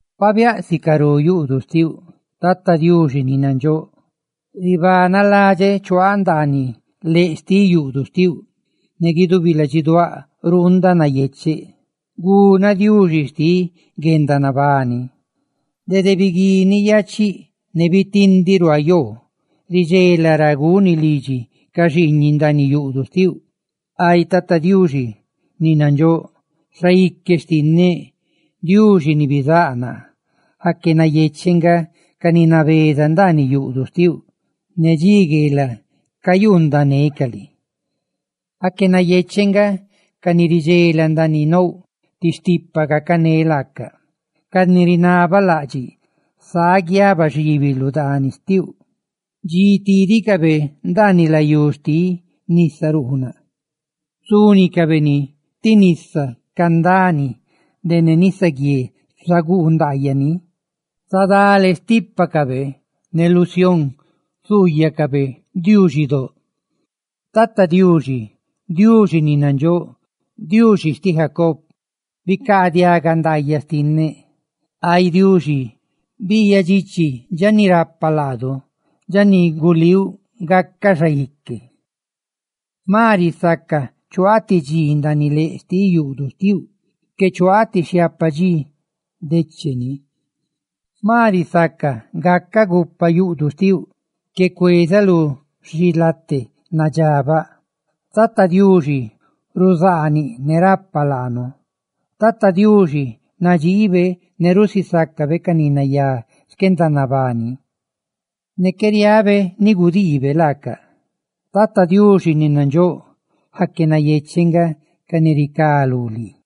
¡Pabiáꞌ sicarú yuꞌduꞌ xtiuꞌ, Tata Diuxi ni nandxóꞌ! ¡Ribanaladxeꞌ chuaaꞌ ndaaniꞌ leꞌ xtiꞌ yuꞌduꞌ xtiuꞌ! ¡Ne guidubi ladxiduáꞌ ruundaꞌ nayecheꞌ guna Diuxi xtiꞌ guendanabani! Dede biguini yaachia ne bitindiꞌ ruaa yoo ridxela ra guni lidxi ca xiiñiꞌ ndaaniꞌ yuꞌduꞌ xtiuꞌ, ay Tata Diuxi ni nandxóꞌ, Xaique xtinneꞌ, Diuxi ni bizáꞌ naa. ¡Aque nayecheꞌ nga ca ni nabeza ndaaniꞌ yuꞌduꞌ xtiuꞌ, ne dxi gueelaꞌ cayuundanecaꞌ lii! ¡Aque nayecheꞌ nga ca ni ridxela ndaaniꞌ nouꞌ ti stipa gacané laacaꞌ, ca ni rinabalaꞌdxiꞌ sáꞌ guiaba xibi lu dani xtiuꞌ! Dxi tídicabe ndaaniꞌ layú xtiꞌ Nisa Ruunaꞌ zúnicabe ni ti nisa candani, de ne nisaguié zaguu ndaayaꞌ ni; zadale xtípacabe, ne lu dani Sión zuuyacabe Diuxi ni nandxóꞌ. Tata Diuxi, Diuxi ni nandxóꞌ, Diuxi xtiꞌ Jacob, ¡bicaadiaga ndaayaꞌ xtinneꞌ! Ay Diuxi, biiyaꞌ dxichi dxa ni rapa laadu, dxa ni gulíuꞌ gaca xaique. ¡Jma risaca chuaaꞌ ti dxi ndaaniꞌ leꞌ xtiꞌ yuꞌduꞌ xtiuꞌ, que chuaaꞌ ti xhiapa dxi decheni! Jma risaca gacaꞌ gupa yuꞌduꞌ xtiuꞌ, que cuezaꞌ lu xilate nadxabaꞌ. Tata Diuxi ruzaaniꞌ ne rapa laanu; Tata Diuxi nadxiibe ne rusisácabe ca ni nayá xquendanabani, ne qué riabe ni gudiibe laacaꞌ. Tata Diuxi ni nandxóꞌ, ¡aque nayecheꞌ nga ca ni ricá lú lii!